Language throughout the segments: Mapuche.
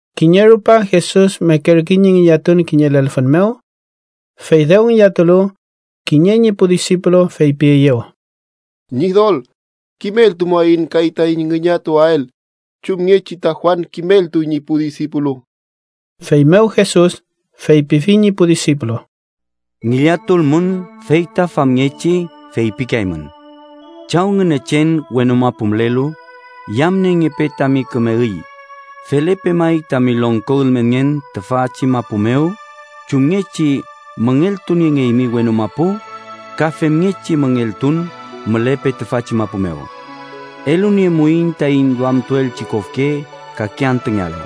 Kiñe rupa Jesus mekerkey ñi ngillatun kiñe lelfün mew. Fey dew ngillatulu, kiñe ñi pu disipulu feypieyew: —Ñidol, kimeltumuaiñ kay taiñ ngillatuael, chumngechi ta Juan kimeltuy ñi pu disipulu. Feymew Jesus feypifi ñi pu disipulu: —Ngillatulmün, fey ta famngechi feypikeaymün: ‘Chaw Ngünechen wenu mapu mülelu, yamniengepe tami küme üy. Felepe may tami longko ülmenngen tüfachi mapu mew. Chumngechi müngeltuniengeymi wenu mapu ka femngechi müngeltun mülepe tüfachi mapu mew. Eluniemuaiñ taiñ duamtuelchi kofke kake antüngealu.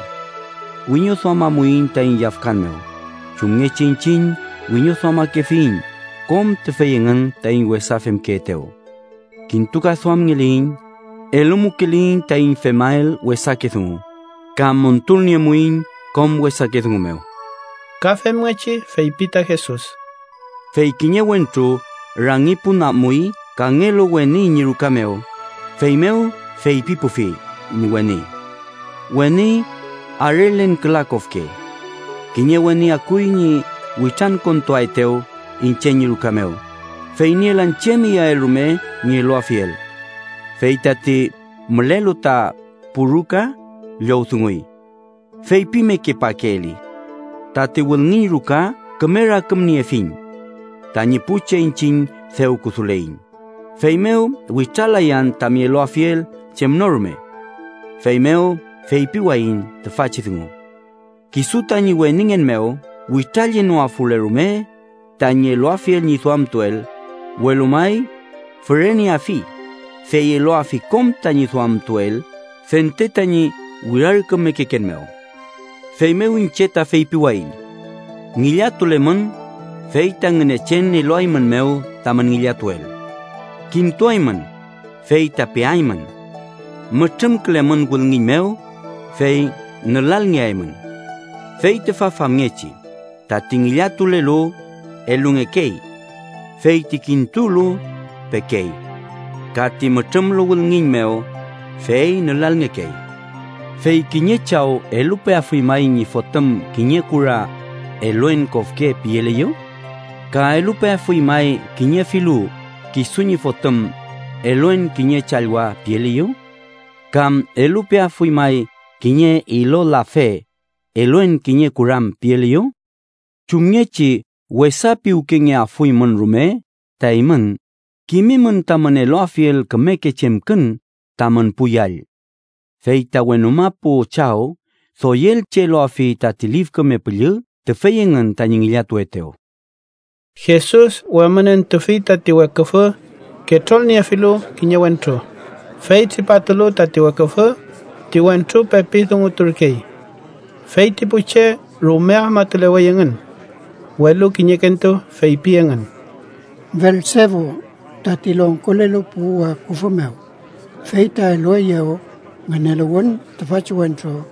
Wiñoduamamuiñ taiñ yafkan mew chumngechi iñchiñ wiñoduamakefiyiñ kom tüfey engün taiñ wesa femkeetew. Kintukaduamngeliyiñ, eluwmukeliyiñ taiñ femael wesake dungu ka montulniemuiñ kom wesake dungu mew.’ Ka femngechi feypi ta Jesus: —Fey kiñe wentru rangi pun amuy kangelu weni ñi ruka mew, feymew feypipufi ñi weni: ‘Weni, arelen küla kofke. Kiñe weni akuy ñi witrankontuaetew iñche ñi ruka mew, fey nielan chem iyael rume ñi eluafiel.’ Fey tati mülelu ta pu ruka llowdunguy: ‘¡Feypimekepakeeli! Tati wülngiñ ruka küme rakümniefiñ. Tañi pu che iñchiñ dew kuduleiñ, feymew witralayan tami eluafiel chem no rume.’ Feymew feypiwayiñ tüfachi dungu: kisu tañi weningen mew witrallenoafule rume tañi eluafiel ñi duamtuel, welu may füreneafi, fey eluafi kom tañi duamtuel fente tañi wirarkümekeken mew. “Feymew iñche ta feypiwayiñ: Ngillatulemün, fey ta Ngünechen eluaeymünmew tamün ngillatuel. Kintuaymün, fey ta peaymün. Mütrümkülemün wülngiñ mew, fey nülalngeaymün. Fey tüfa famngechi: tati ngillatulelu, elungekey. Fey ti kintulu, pekey. Ka ti mütrümlu wülngiñ mew, fey nülalngekey. “¿Fey kiñe chaw elupeafuy may ñi fotüm kiñe kura, ‘eluen kofke’ pieliyew? ¿Ka elupeafuy may kiñe filu kisu ñi fotüm, ‘eluen kiñe challwa’ pieliyew? ¿Kam elupeafuy may kiñe ilolafe, ‘eluen kiñe kuram’ pieliyew? Chumngechi wesa piwkengeafuymün rume ta eymün, kimimün tamün eluafiel kümeke chemkün tamün pu yall. ¡Fey ta wenu mapu Chaw doyelchi eluafi tati Lif Küme Püllü tüfey engün tañi ngillatuetew!” Jesus wemünentufi tati weküfü ketrolniefilu kiñe wentru, fey tripatulu tati weküfü, ti wentru pepi dunguturkey. Fey ti pu che rume afmatulewey engün. Welu kiñekentu feypi engün: “Belsebu, tati longkolelu pu weküfü mew, fey ta elueyew ngüneluwün tüfachi wentru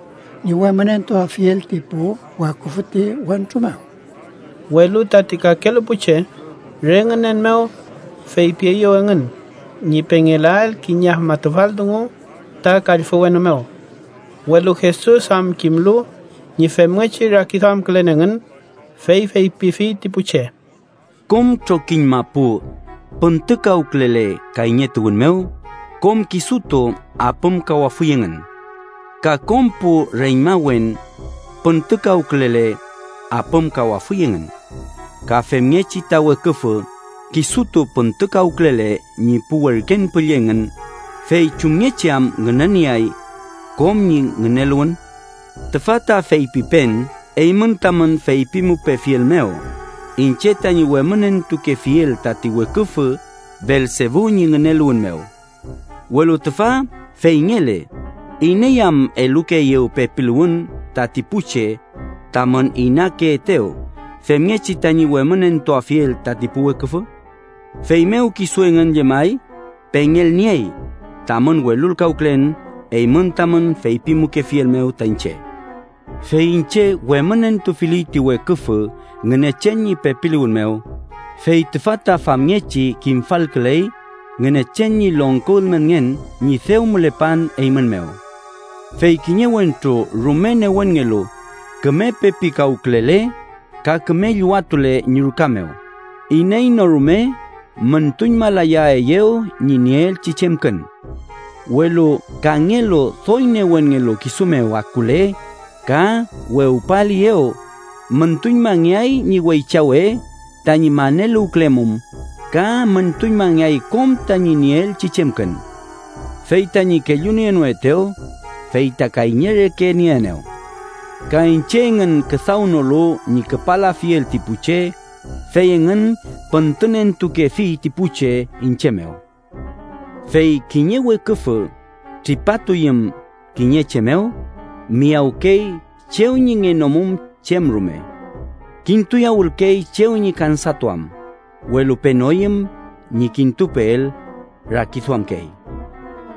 ñi wemünentuafiel ti pu weküfü ti wentru mew.” Welu tati kakelu pu che, re ngünen mew, feypieyew engün ñi pengelael kiñe afmatufal dungu ta kallfü wenu mew. Welu Jesus am kimlu ñi femngechi rakiduamkülen engün, fey feypifi ti pu che: “Kom trokiñ mapu püntükawkülele kayñetuwün mew, kom kisutu apümkawafuy engün. Ka kom pu reñmawen püntükawkülele, apümkawafuy engün. Ka femngechi ta weküfü kisutu püntükawkülele ñi pu werken püllü engün, ¿fey chumngechi am ngünenieay kom ñi ngüneluwün? Tüfa ta feypipen eymün tamün feypimupefiel mew iñche tañi wemünentukefiel tati weküfü Belsebu ñi ngüneluwün mew. Welu tüfa feyngele, ¿iney am elukeeyew pepiluwün tati pu che tamün inakeetew femngechi tañi wemünentuafiel tati pu weküfü? Feymew, kisu engün llemay pengelniey tamün welulkawkülen eymün tamün feypimukefiel mew ta iñche. Fey iñche wemünentufili ti weküfü Ngünechen ñi pepiluwün mew, fey tüfa ta famngechi kimfalküley Ngünechen ñi longko ülmenngen ñi dew mülepan eymün mew. “Fey kiñe wentru rume newenngelu küme pepikawkülele ka küme llüwatule ñi ruka mew, iney no rume müntuñmalayaeyew ñi nieelchi chemkün. Welu kangelu doy newenngelu, kisu mew akule ka wewpaeliyew, müntuñmangeay ñi weychawe tañi maneluwkülemum, ka müntuñmangeay kom tañi nieelchi chemkün. “Fey tañi kellunienoetew, fey ta kayñe reke nieenew. Ka iñche engün küdawnolu ñi küpalafiel ti pu che, fey engün püntünentukefi ti pu che iñche mew. “Fey kiñe weküfü tripatuyüm kiñe che mew, miyawkey chew ñi ngenomum chem rume. Kintuyawülkey chew ñi kansatuam, welu penoyüm ñi kintupeel, rakiduamkey: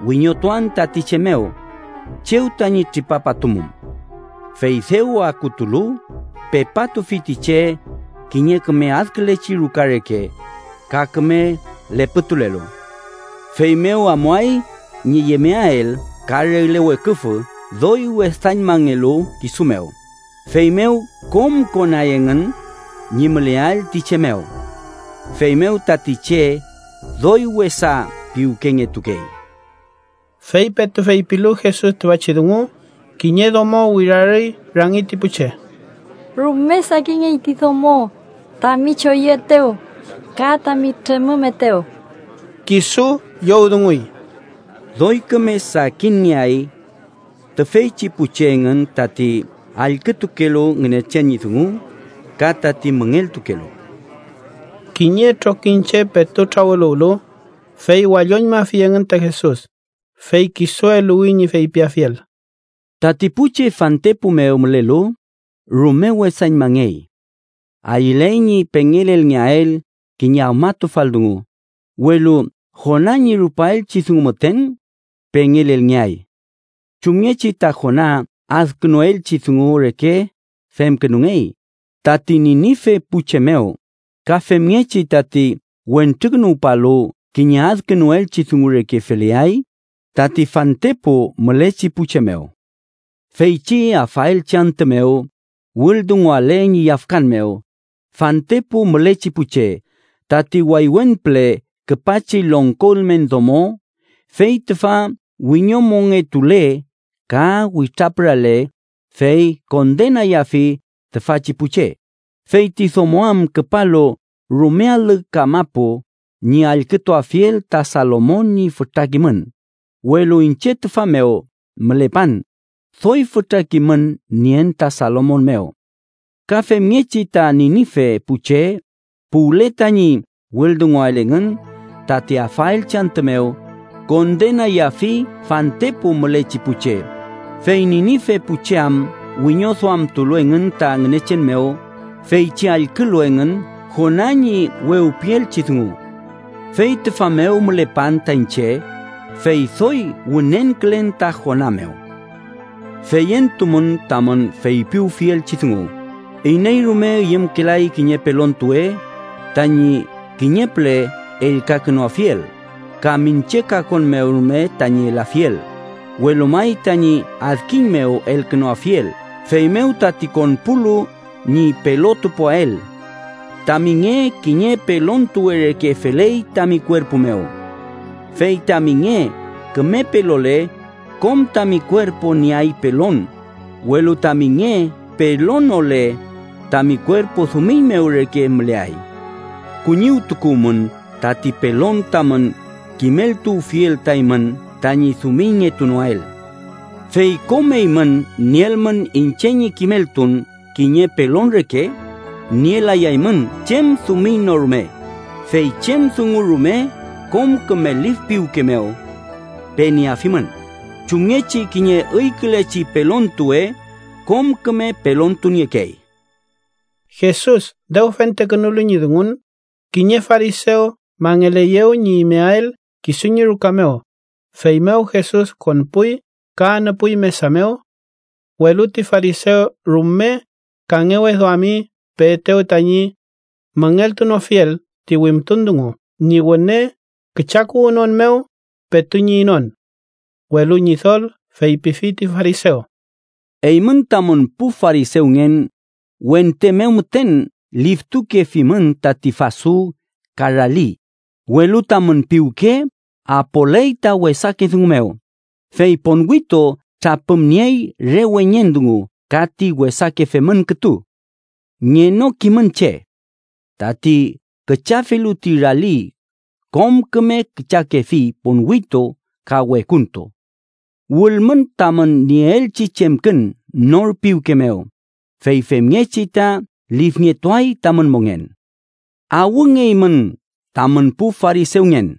‘Wiñotuan tati che mew chew tañi tripapatumum.’ Fey dew akutulu, pepatufi ti che kiñe küme adkülechi ruka reke, ka küme lepütulelu. Feymew amuay ñi yemeael ka regle weküfü doy wesañmangelu kisu mew, feymew kom konay engün ñi müleael ti che mew. Feymew tati che doy wesa piwkengetukey.” Fey petu feypilu Jesus tüfachi dungu, kiñe domo wirarüy rangi ti pu che: —¡Rume sakinngey ti domo tami choyüetew ka tami tremümetew! Kisu llowdunguy: —Doy küme sakinngeay tüfeychi pu che engün tati allkütukelu Ngünechen ñi dungu, ka tati müngeltukelu. Kiñe trokiñche petu trawüluwlu, fey walloñmafi engün ta Jesus, fey kisu eluwi ñi feypiafiel: “Tati pu che fantepu mew mülelu, rume wesañmangey. Ayüley ñi pengelelngeael kiñe afmatufal dungu, welu Jona ñi rupaelchi dungu müten pengelelngeay. Chumngechi ta Jona adkünuelchi dungu reke femkünungey tati Ninife pu che mew ka femngechi tati Wentrukünuwpalu kiñe adkünuelchi dungu reke feleay tati fantepu mülechi pu che mew. Feychi afaelchi antü mew wüldunguale ñi yafkan mew fantepu mülechi pu che, tati waywen püle küpachi longko ülmen domo fey tüfa wiñomongetule ka witrapürale fey kondenayafi tüfachi pu che, fey ti domo am küpalu rume alü kamapu ñi allkütuafiel ta Salomon ñi fütra kimün, welu iñche tüfa mew mülepan, doy fütra kimün nien ta Salomon mew. Ka femngechi ta Ninife pu che puwle tañi wüldungael engün tati afaelchi antü mew, kondenayafi fantepu mülechi pu che, fey Ninife pu che am wiñoduamtulu engün ta Ngünechen mew feychi allkülu engün Jona ñi wewpielchi dungu. Fey tüfa mew mülepan ta iñche, fey doy wünenkülen ta Jona mew. “Feyentumün tamün feypiwfielchi dungu: iney rume üyümkelay kiñe pelontuwe tañi kiñe püle ellkakünuafiel, ka miñche kakon mew rume tañi elafiel, welu may tañi adkiñ mew elkünuafiel, feymew tati konpulu ñi pelotupuael. Tami nge kiñe pelontuwe reke feley tami kuerpu mew. Fey tami nge küme pelole, kom tami kuerpu nieay pelon, welu tami nge pelonole, tami kuerpu dumiñ mew reke müleay. Kuñiwtukuwmün tati pelon tamün kimeltuwfiel ta eymün tañi dumiñngetunoael. Fey kom eymün nielmün iñche ñi kimeltun kiñe pelon reke, nielayay chem dumiñ no rume, fey chem dungu rume kom küme lif piwke mew penieafimün, chumngechi kiñe üykülechi pelontuwe kom küme pelontuniekey.” Jesus dew fentekünulu ñi dungun, kiñe farisew mangeleyew ñi imeael kisu ñi ruka mew, feymew Jesus konpuy ka anüpuy mesa mew. Welu ti farisew rume kangeweduami peetew tañi müngeltunofiel ti wimtun dungu ñi wüne küchakuwünon mew petu ñi inon. Welu Ñidol feypifi ti farisew: —Eymün tamün pu farisewngen wente mew müten liftukefimün tati fasu ka rali, welu tamün piwke apoley ta wesake dungu mew, fey ponwitu trapümniey re weñen dungu ka ti wesake femün kütu. ¡Ngenokimün che! Tati küchafilu ti rali kom küme küchakefi ponwitu ka wekuntu. Wülmün tamün nieelchi chemkün nor piwke mew, fey femngechi ta lifngetuay tamün mongen. “¡Awngeymün tamün pu farisewngen!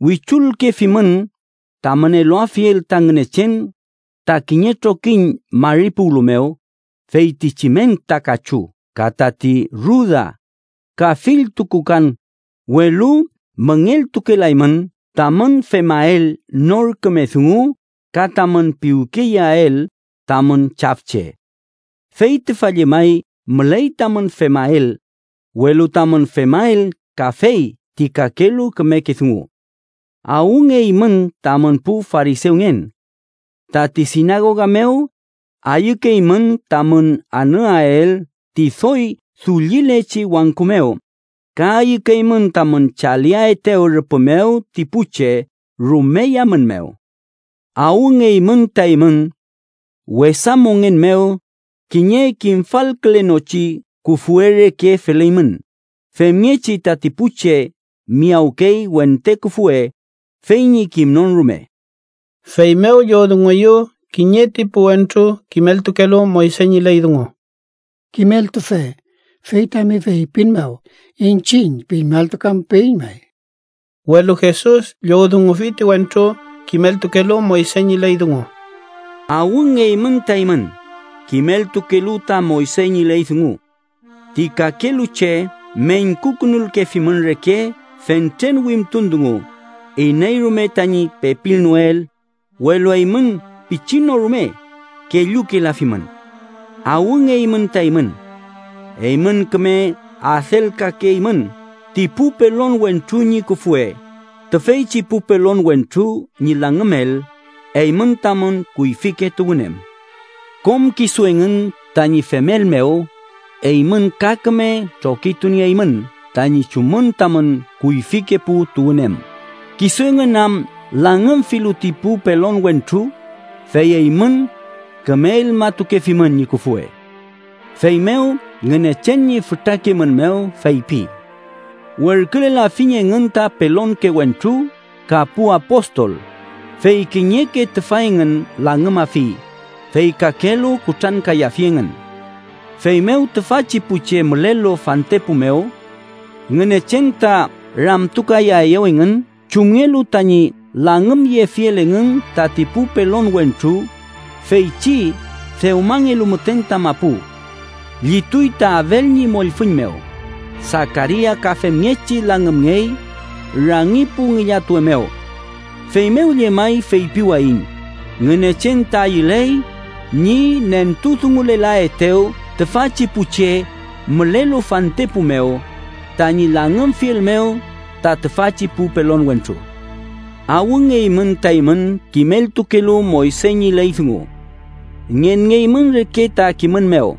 Wichulkefimün tamün eluafiel ta Ngünechen ta kiñe trokiñ mari puwlu mew feytichi menta kachu ka tati ruda ka fill tukukan, welu müngeltukelaymün tamün femael nor küme dungu ka tamün piwkeyeael tamün chafche. Fey tüfa llemay müley tamün femael, welu tamün femael kafey ti kakelu kümeke dungu. “¡Awngeymün tamün pu farisewngen! Tati sinagoga mew ayükeymün tamün anüael ti doy dullilechi wangku mew ka ayükeymün tamün chaliaetew rüpü mew ti pu che rume yamün mew. “¡Awngeymün ta eymün tamün wesa mongen mew kiñe kimfalkülenochi küfwe reke feleymün, femngechi tati pu che miyawkey wente küfwe, fey ñi kimnon rume!” Feymew llowdungueyew kiñe ti pu wentru kimeltukelu Moyse ñi ley dungu: —Kimeltufe, fey tami feypin mew iñchiñ piñmaltukamupeiñ may. Welu Jesus llowdungufi ti wentru kimeltukelu Moyse ñi ley dungu: —¡Awngeymün ta eymün, kimeltukelu ta Moyse ñi ley dungu! Ti kakelu che meñkukünulkefimün reke fentren wimtun dungu, iney rume tañi pepilnoel, welu eymün pichin no rume kellukelafimün. “¡Awngeymün ta eymün! Eymün küme adelkakeymün ti pu pelon wentru ñi küfwe, tüfeychi pu pelon wentru ñi langümel eymün tamün kuyfike tuwün em. Kom kisu engün tañi femel mew eymün ka küme trokitunieymün tañi chumün tamün kuyfike pu tuwün em, kisu engün am langümfilu ti pu pelon wentru, fey eymün küme elmatukefimün ñi küfwe. Feymew Ngünechen ñi fütra kimün mew feypi: ‘Werkülelafiñ engün ta pelonke wentru ka pu apostol, fey kiñeke tüfa engün langümafi, fey kakelu kutrankayafi engün.’ Feymew tüfachi pu che mülelu fantepu mew Ngünechen ta ramtukayaeyew engün chumngelu tañi langümyefiel engün tati pu pelon wentru feychi dewmangelu müten ta mapu. Llituy ta Abel ñi mollfüñ mew, Sakaria ka femngechi langümngey rangi pu ngillatuwe mew. Feymew llemay feypiwayiñ, Ngünechen ta ayüley ñi nentudungulelaetew tüfachi pu che mülelu fantepu mew tañi langümfiel mew ta tüfachi pu pelon wentru. “¡Awngeymün ta eymün kimeltukelu Moyse ñi ley dungu! Ngenngeymün reke ta kimün mew,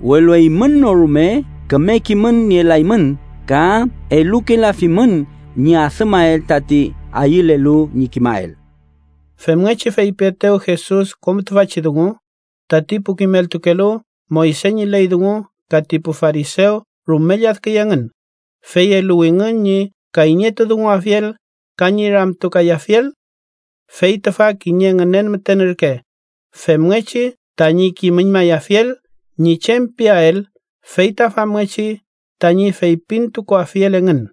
welu eymün no rume küme kimün nielaymün ka elukelafimün ñi adümael tati ayülelu ñi kimael.” Femngechi feypietew Jesus kom tüfachi dungu, tati pu kimeltukelu Moyse ñi ley dungu ka ti pu farisew rume lladküy engün, fey eluwingün ñi kayñetudunguafiel ka ñi ramtukayafiel. Fey tüfa kiñe ngünen müten ürke femngechi tañi kimüñmayafiel ñi chem piael fey ta famngechi tañi feypintukuafiel engün.